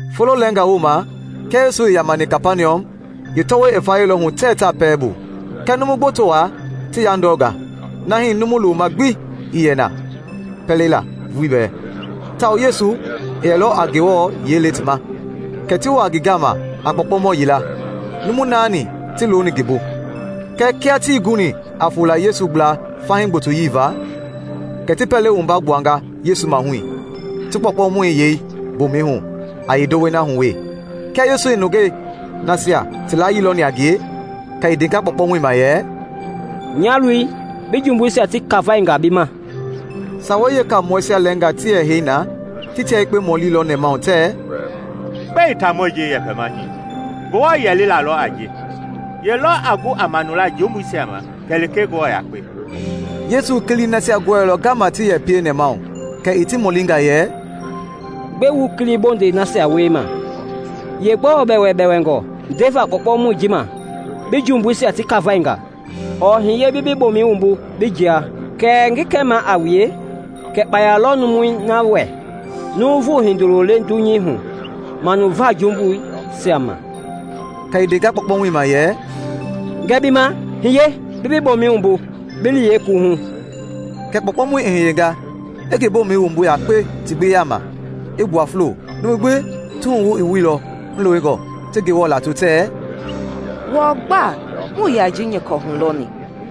Folo lɛɛngaa wooma kia Yesu i yamani Kapaniɔm, yeetɔwɔi i vayɛilɔ hu tɛɛ taa pɛlei bu. Kɛ numu gboto wa ti yandɔnga, na hii numu loma gbi ii yɛ ya na pɛlei la vulii bɛɛ, tawao Yesu i yɛlɔ a Ngewɔ yiɛi le ti ma. Kɛ ti waa ngi gama a kpɔɔkpɔmɔ yila, numu naani ti looni ngi bu. Kɛɛ kia tii guni a fola Yesu gbla fahii gbotoyii va, kɛ ti pɛlei wumba gbuanga Yesu mahui, ti kpɔɔkpɔmɔi yei mboomɛi hu a yeendowei na hu wee. Kia Yesu i nungei nasia ti layii lɔni a ngie, kɛ i ndenga kpɔɔkpɔmɔi ma yɛ, “Nya loi, bi jumbuisia ti kafainga bi ma.” Sawei Yeekamɔɛisia lɛɛnga ti yɛ heini na ti tia yekpe mɔlilɔ nɛmahu, tɛɛ, “Gbɛe taamɔi ji i yɛpɛma hii? Ngewɔ yɛlila lɔ a ji! Ye lɔ a gu a manula jumbubleisia ma kɛlee Ngewɔ yakpe?” Yesu i kilii nasia gɔɛilɔ ngama ti yɛ pie nɛmahu, kɛ i ti mɔlinga yɛ, “Gbɛe wu kili bondɛi nasia wiema? Yeegbɔɔ bɛwɛbɛwɛngɔ ndeva kpɔɔkpɔmɔi ji ma, ‘Bi jumbuisia ti kafainga,’ ɔɔ ‘Hiye bi bi bomɛi wumbu bi jia’? Kɛɛ ngi kɛmaa a wue kɛ kpaya lɔ numui na wɛ Nuuvu Hindoloi le dunyei hu manuva jumbuisia ma.” Kɛ i ndenga kpɔɔkpɔmɔi ma yɛ, “Ngɛɛ bi ma, hiye, bi bi bomɛi wumbu, bi li bi yeekuwuhu.” Kɛ kpɔɔkpɔmɔi i hiyenga, i ngi bomɛi wumbu yakpe ti gbi yama, i gbua fulo. Numui gbi ti wuhu i wuilɔ hulewengɔ, ti Ngewɔ lato tɛɛ, “Wɔɔ gba muii ya ji nyɔkɔ hulɔni.”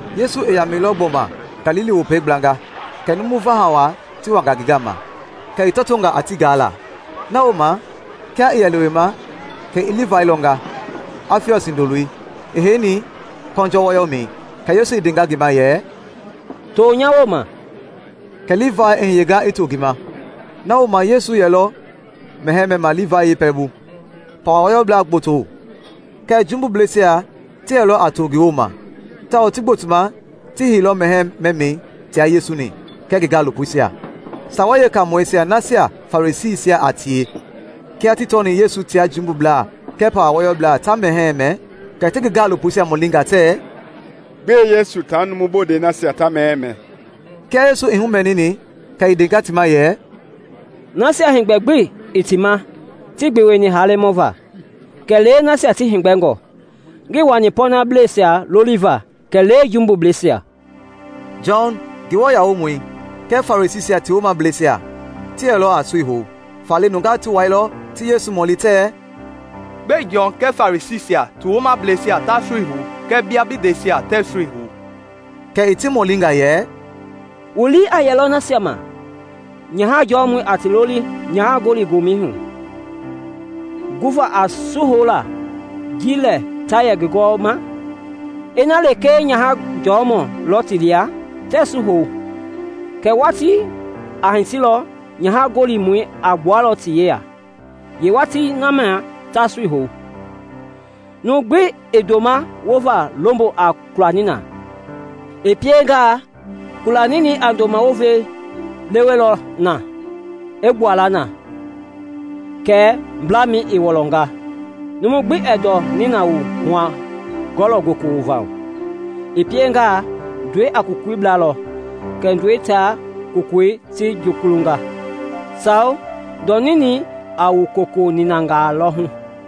Yesu i yamɛilɔ gbɔma Galili Wopei gblanga, kɛ numu vaha wa ti wanga ngi gama, kɛ i tɔtonga a ti gaala. Na wooma kia i yɛ lewema kɛ i Livai lɔnga, Afiɔs hindoloi, i heini kɔnjɔ wɔyɔmɛi. Kɛ Yesu i ndenga ngi ma yɛ, “To nya wooma.” Kɛ Livai i hiyenga i to ngi ma. Na wooma Yesu yɛlɔ mɛhɛɛ mɛma Livai yeepɛlɛbu. Pawa wɔyɔblaa gboto kɛɛ jumbubleisia ti yɛlɔ a to ngi wooma, tawao ti gbotoma ti heilɔ mɛhɛɛ mɛmɛi tia Yesu-ni kɛɛ ngi gaalopoisia. Sawei Yeekaamɔi nasia Farisiisia a tie, kia ti tɔni Yesu tia jumbublaa kɛɛ pawa wɔyɔblaa ta mɛhɛɛ mɛ, kɛ ti ngi gaalopoisia mɔlinga tɛɛ, “Gbɛe Yesu tia numu bondɛi nasia ta mɛhɛɛ mɛ?” Kia Yesu i humɛnini, kɛ i ndenga ti ma yɛ, “Nasia heegbɛ gbi ii ti ma tii gbeweni halemɔ va, kɛlee nasia ti heegbɛngɔ; ngii wani pɔɔnableisia loliva, kɛlee jumbubleisia.” Jɔn, Nguamɔi, kɛɛ Farisiisia ti woomableisia ti yɛlɔ a sui hou; faale nungaa ti wailɔ ti Yesu mɔli tɛɛ, “Gbɛe Jɔn kɛɛ Farisiisia ti woomableisia ta sui hou kɛɛ bia bi ndɛisia tɛɛ su hou?” Kɛ i ti mɔlinga yɛ, “Wu lii a yɛlɔ nasia ma nyaha jɔmɔi a ti loli nyaha gɔli gɔmɛi hu guva a su houla ji lɛ ta yɛ ngi gɔwɔma? Ina lekee nyaha jɔɔmɔi lɔ ti lia, tɛɛ su hou. Kɛɛ watii a hitilɔ nyaha gɔlimɔi a gbua ti yeya; yeewatii na mia ta sui hou. Numu gbi ɛɛ ndoma wova lombo a kula nina; i piengaa, kula ninɛi a ndoma wovei lewelɔ ma i gbua la na kɛ mblamɛi i wɔlɔnga. Numu gbi ɛɛ ndɔ nina wu hua-kɔlɔ goko wova hu; i piengaa, ndɔi a kokoi blalɔ, kɛ ndɔi tia kokoi ti jukulunga. Sao! Ndɔ ninɛi a wu koko niinangaa lɔ hu.”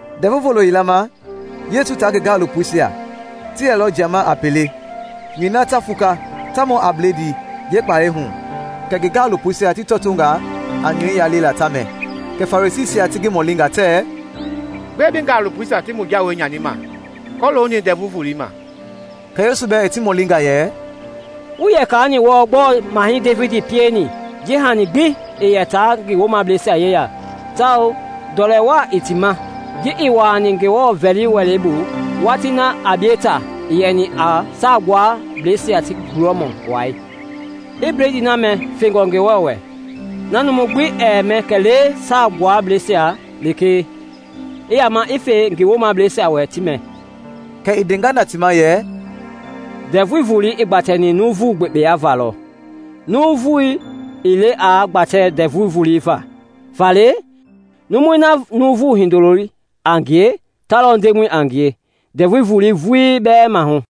Ndɛvu Volo yila ma Yesu taa ngi gaalopoisia ti yɛlɔ jiama a pelei nyɔi na ta fuka ta mɔ a bledii yeekpalɛi hu; kɛ ngi gaalopoisia ti tɔtonga a nyɔi yalela ta mɛ. Kɛ Farisiisia ti ngi mɔlinga tɛɛ, “Gbɛe bi gaalopoisia ti mu jawei nyanima kɔlooni Ndɛvu Voloi ma?” Kɛ Yesu bɛɛ i ti mɔlinga yɛ, “Wuii ya kaani wɔɔ gbɔɔ Mahɛi Devidi pieni ji hani gbi ii yɛ taa ngi woomableisia yeya tawao ndɔlɛ wa i ti ma, ji i wuani Ngewɔ vɛli wɛlɛi bu watii na Abieta i yɛni a Saagbuablɛisia ti gulɔmɔ wai, i bledii na mɛ fengɔ Ngewɔ wɛ, na numu gbi ɛɛ mɛ kɛlee Saa Gbuablɛisia lekee, i yama i fe ngi woomableisia wɛ ti mɛ?” Kɛ i ndenga na ti ma yɛ, “Ndɛvu Volei i gbatɛni nuuvu gbekpeya va lɔ, nuuvu ii le aa gbatɛ Ndɛvu Volei va. Faale, numui na Nuuvu Hindoloi a ngie, ta lɔ Ndemɔ a ngie Ndɛvu Volei vulii bɛɛ mahu.”